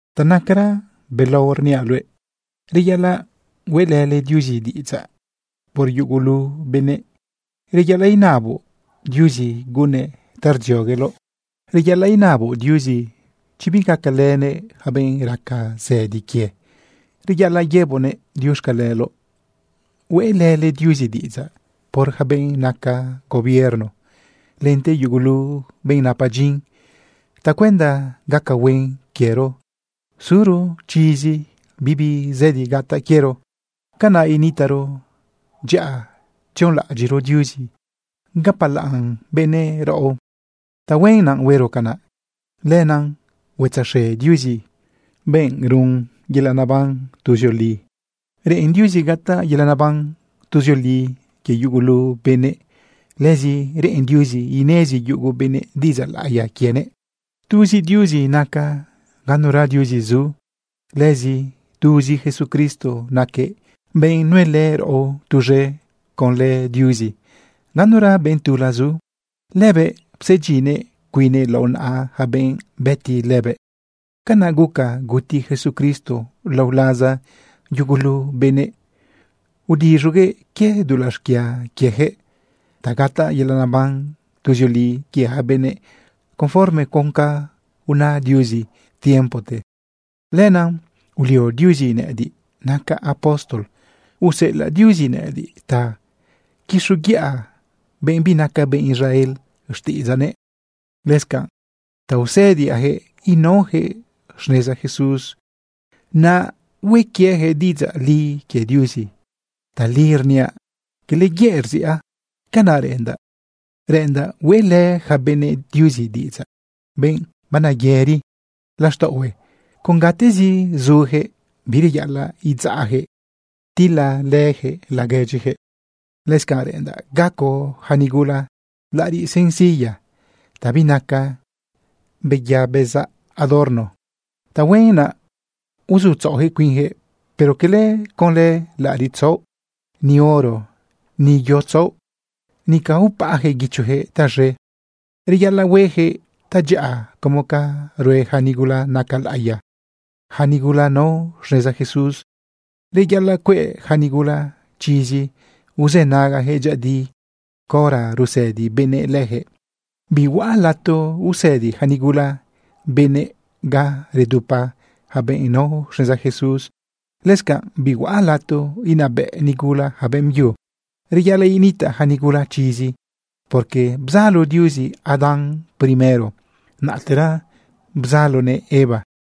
Ta nacaran belao rniaꞌ luëꞌ, reyaꞌalaꞌ hueꞌlële Diuzi diꞌidzaꞌ por yugulu benëꞌ. Reyaꞌalaꞌ inaboꞌ Diuzi gunnëꞌ ta rdziogueloꞌ. Reyaꞌalaꞌ inaboꞌ Diuzi chi bigacalënëꞌ yaca benꞌ raca zëdi quie. Reyaꞌalaꞌ yëboꞌnëꞌ diuxcaleloꞌ. Hueꞌlële Diuzi diꞌidzaꞌ por yaca benꞌ naca gobierno, lente yugulu benꞌ napa dyin tacuenda gaca huen quiero suro chizi, bibi zëdi gataꞌ quiero. Canaꞌ initaꞌro dyaꞌa tzionlaꞌadyiꞌro Diuzi, gapalaꞌn benëꞌ raꞌo. Tahuen naꞌ huero canaꞌ. Lenaꞌ huetzaxe Diuzi, benꞌ run benëꞌ yelaꞌ neban tuzioli. Reꞌen Diuzi gataꞌ yelaꞌ neban tuzioli quie yugulu benëꞌ. Lëzi reꞌen Diuzi inezi yugu benëꞌ diꞌidzaꞌ laꞌiya quienëꞌ. Tuzi Diuzi naca, ganura diuzi zu. Lëzi tuzi Jesucristo naquëꞌ benꞌ nuelë raꞌo tuz̃e conlë Diuzi, ganura benꞌ tula zu. Lëbëꞌ psedyinnëꞌ cuinnëꞌ lao naꞌa yaca benëꞌ bëti lëbëꞌ. Canaꞌ guca guti Jesucristo lao laza yugulu benëꞌ, udiz̃uguëꞌ quie dulaꞌ xquia quieyaquëꞌ ta gataꞌ yelaꞌ neban tuzioli quie yaca benëꞌ conforme con ca una Diuzi tiempote. Lenaꞌ ulio Diuzi nëꞌëdiꞌ nacaꞌ apóstol useꞌelaꞌ Diuzi nëꞌëdiꞌ ta quixoguiꞌa benꞌ binaca benꞌ Israel xtiꞌidzaꞌnëꞌ, lëscanꞌ ta usëdiaꞌyaquëꞌ inaoyaquëꞌ xneza Jesús, naꞌ hue quieyaquëꞌ diꞌidzaꞌ li quie Diuzi. Tali rniaꞌ, cala yëꞌ rziꞌa. Canaꞌ reꞌendaꞌ, reꞌendaꞌ hueꞌlë yaca benëꞌ Diuzi diꞌidzaꞌ, benꞌ baneyëri laxtaꞌohue con gatezi zuyaquëꞌ. Bireyaꞌalaꞌ idzaꞌjëꞌ tilalëyaquëꞌ laguedyijëꞌ. Lëscanꞌ reꞌendaꞌ gaco yaca nigula laꞌariꞌ sencilla ta binaca beya bezaꞌ adorno. Tahuen naꞌ uzutzaꞌoyaquëꞌ cuinyaquëꞌ, pero cala conlë laꞌariꞌ tzaoꞌ, ni oro, ni yo tzaoꞌ, nica upaꞌayaquëꞌ guichoyaquëꞌ taz̃e. Reyaꞌalaꞌ hueyaquëꞌ tadyaꞌa como ca rue yaca nigula naca laꞌiya, yaca nigula nao xneza Jesús. Reyaꞌalaꞌ cueꞌ yaca nigula chizi uzënagayaquëꞌ dyëꞌëdi caora rusëdi benëꞌ leyaquëꞌ. Bihuaꞌ lato usëdi yaca nigula benëꞌ ga redupa yaca benꞌ nao xneza Jesús. Lëscanꞌ bihuaꞌ lato inabëꞌ nigula yaca beꞌmbyu. Reyaꞌalaꞌ initaꞌ yaca nigula chizi, porque bzalo Diuzi Adán primero, naꞌtera bzaloguëꞌ Eva.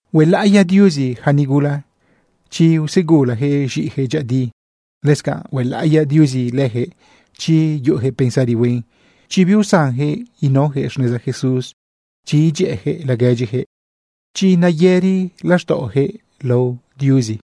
Huelaꞌiya Diuzi yaca nigula chi usegulayaquëꞌ z̃iꞌiyaquëꞌ dyëꞌëdi. Lëscanꞌ huelaꞌiya Diuzi leyaquëꞌ, chi yuꞌuyaquëꞌ pensari huen, chi biusanyaquëꞌ inaoyaquëꞌ xneza Jesús, chi idyëꞌëyaquëꞌ laguedyiyaquëꞌ, chi nayëri laxtaꞌoyaquëꞌ lao Diuzi.